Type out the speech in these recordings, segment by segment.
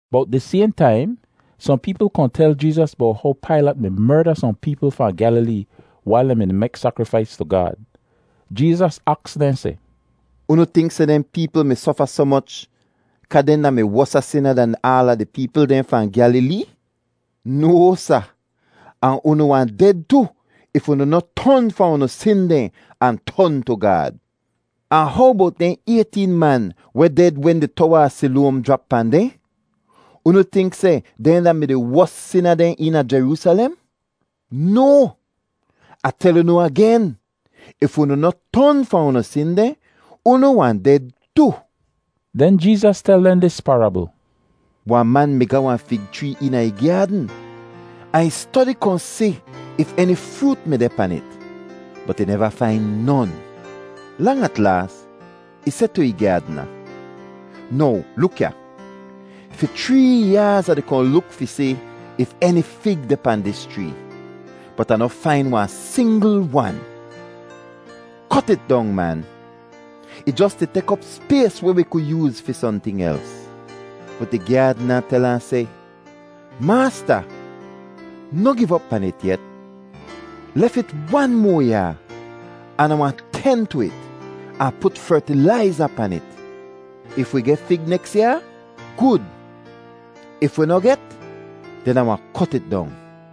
Bowt dis sayhn taim, sohn peepl kohn tel Jeezas bowt how Pailat mi merda sohn peepl fahn Gyalilee wail dehn mi-di mek sakrifais tu Gaad. Jeezas aks dehn seh, “Unu tink seh dehn peepl mi sofa soh moch kaa dehn da-mi wosa sina dan di ada peepl dehn fahn Gyalilee? No, sa! Ahn unu wahn ded tu if unu noh ton fahn unu sin dehn ahn ton tu Gaad. Ahn how bowt dehn ayteen man weh ded wen di Towa a Siloam jrap pahn dehn? Unu tink seh dehn da-mi di wos sina dehn eena Jeroosalem? No! Ah tel unu agen, if unu noh ton fahn unu sin dehn, unu wahn ded tu.” Den Jeezas tel dehn dis parabl: “Wahn man mi ga wahn fig chree eena ih gyaadn ahn ih stodi kohn si if eni froot mi deh pan it. Bot ih neva fain non. Lang at laas, ih seh tu ih gyaadna, ‘Now luk ya, fi chree yaaz Ah di kohn luk fi si if eni fig deh pahn dis chree, bot Ah noh fain wahn singl wan. Kot it dong, man. Ih jos di tek op spays weh wi ku yooz fi sohnting els.’ “Bot di gyaadna tel ahn seh, ‘Maasta, noh giv op pan it yet. Lef it wan moa yaa, an Ah wahn ten tu it, ahn put fertilaiza pan it. If wi geh fig neks yaa, gud. If wi noh get, den Ah wahn kot it dong.’”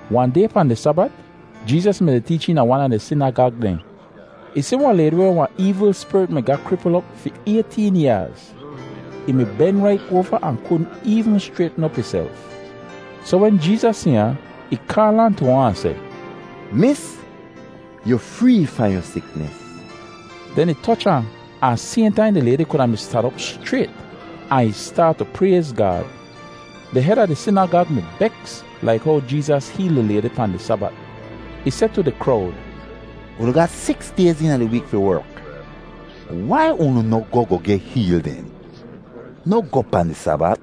Wahn day pahn di Sabat, Jeezas mi-di teech eena wan a di sinagag dehn. Ih si wahn laydi weh wan eevl spirit mi ga kripl op fi ayteen yaaz. Ih mi ben rait oava ahn kudn eevn schraytn op ihself. Soh wen Jeezas si ahn, ih kaal ahn tu ahn, ahn seh, “Mis, yu free fahn yu siknis!” Den ih toch ahn, ahn sayhn taim di laydi kuda mi stan op schrayt, ahn ih staat tu prayz Gaad! Di hed a di sinagag mi beks laik how Jeezas heel di laydi pahn di Sabat. Ih seh tu di krowd, “Unu ga siks dayz eena di week fi werk. Wai unu noh goh goh geh heel den? Noh goh pahn di Sabat.”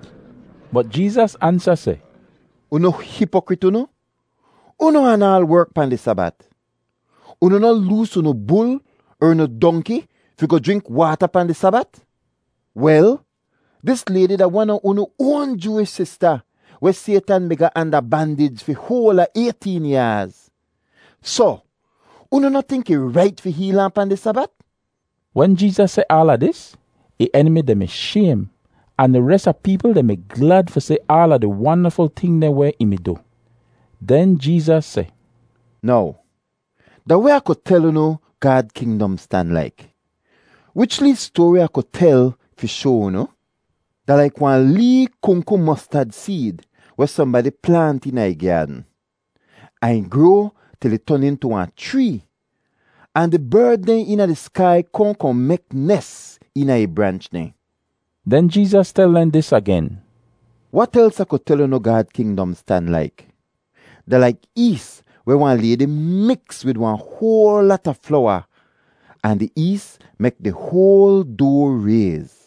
Bot Jeezas ansa seh, “Unu hipokrit unu! Unu anaal werk pahn di Sabat. Unu noh loos unu bul er unu dongki fi goh jrink waata pahn di Sabat? Wel, dis laydi da wan a unu oan Jooish sista weh Saytan mi ga anda bandij fi hoal a ayteen yaaz. Soh unu noh tink ih rait fi heel ahn pahn di Sabat?” Wen Jeezas seh aala dis, ih enimi dehn mi shaym, ahn di res a peepl dehn mi glad fi si aala di wandaful ting dehn weh ih mi du. Den Jeezas seh, “Now, da weh Ah ku tel unu Gaad kingdom stan laik? Wich lee stoari Ah ku tel fi shoa unu? Da laik wahn lee kungku mostad seed weh sohnbadi plaant eena ih gyaadn, ahn ih groa til ih ton intu wahn chree, ahn di berd dehn eena di skai kohn kohn mek nes eena ih branch dehn.” Den Jeezas tel dehn dis agen: “Wat els Ah ku tel unu Gaad kingdom stan laik? Da laik ees weh wahn laydi miks wid wahn hoal lata flowa ahn di ees mek di hoal doa rayz.”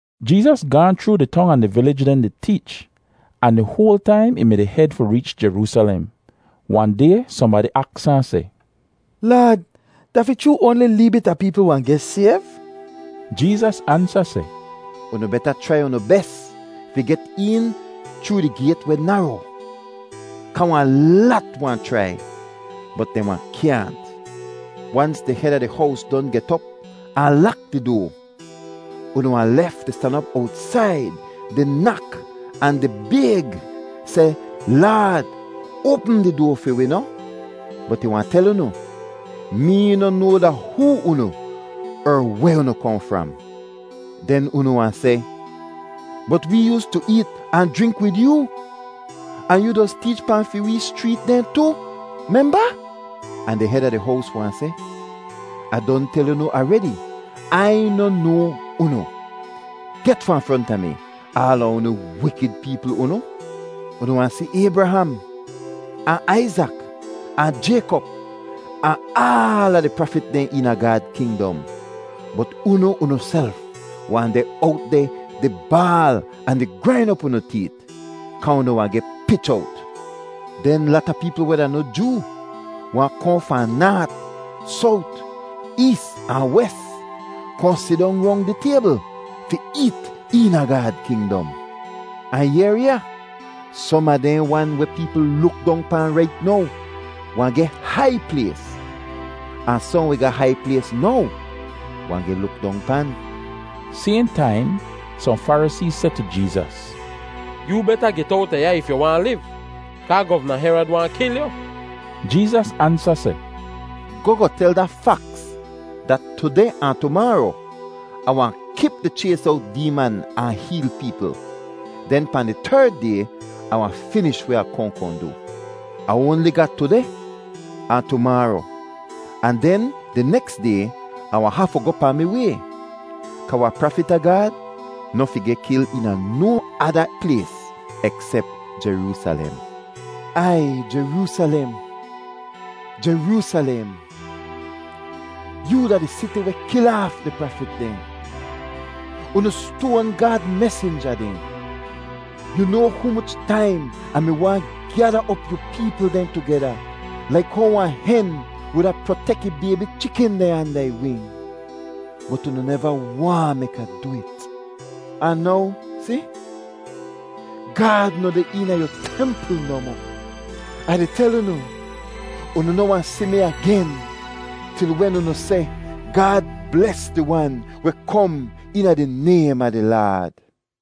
Jeezas gaahn chroo di tong ahn di vilij dehn di teech, ahn di hoal taim ih mi-di hed fi reech Jeroosalem. Wahn day sohnbadi aks ahn seh, “Laad, da fi chroo oanli lee bit a peepl wahn geh sayv?” Jeezas ansa seh, “Unu beta chrai unu bes fi get een chroo di gayt weh naro kaa wahn lat wahn chrai, bot dehn wahn kyaahnt. Wans di hed a di hows don get op ahn lak di doa, unu wahn lef di stan op owtsaid di nak ahn di bayg seh, ‘Laad, oapm di doa fi wi noh?’ “Bot ih wahn tel unu, ‘Mee noh noa da hoo unu er weh unu kohn fram!’ “Den unu wahn seh, ‘Bot wee yoostu eet ahn jrink wid yoo, ahn yoo doz teech pahn fi wee schreet dehn tu, memba?’ “Ahn di hed a di hows wahn seh, ‘Ah don tel unu aredi, Ai noh noa unu! Get fahn fronta mi, aala unu wikid peepl unu!’ “Unu wahn si Aybraham ahn Aizak ahn Jaykop, ahn aala di prafit dehn eena Gaad kingdom, bot unu unuself wahn deh owt deh di baal ahn di grain op unu teet, kaa unu wahn geh pich owt! Den lata peepl weh da noh Joo wahn kohn fahn naat, sowt, ees ahn wes, kohn sidong rong di taybl fi eet eena Gaad kingdom. Ahn yehr ya! Som a dehn wan weh peepl luk dong pahn rait now wahn geh hai plays, ahn sohn weh ga hai plays now wahn geh luk dong pan.” Sayhn taim sohn Farisee seh tu Jeezas, “Yoo beta get owta ya if yu waahn liv kaa Govna Herod waahn kil yu!” Jeezas ansa seh, “Goh goh tel da faks dat tudeh ahn tumaaro Ah wahn kip di chays owt deeman ahn heel peepl, den pahn di terd day Ah wahn finish weh Ah kohn kohn du. Ah oanli ga tudeh ahn tumaaro, ahn den di neks day Ah wahn hafu goh pahn mi way, kaa wahn prafit a Gaad noh fi geh kil eena no ada plays eksep Jeroosalem. “Aiy Jeroosalem, Jeroosalem, yoo da di siti weh kil aaf di prafit dehn; unu stoan Gaad mesinja dehn! Yu noa humoch taim Ah mi waahn gyada op yu peepl dehn tugeda laik how wahn hen wuda protek ih baybi chikin dehn anda ih wing? Bot unu neva waahn mek Ah du it. Ahn now si, Gaad noh deh eena yu templ nohmoh. Ah di tel unu, unu noh wahn si mi agen til wen unu seh, ‘Gaad bles di Wan weh kom eena di naym a di Laad.’”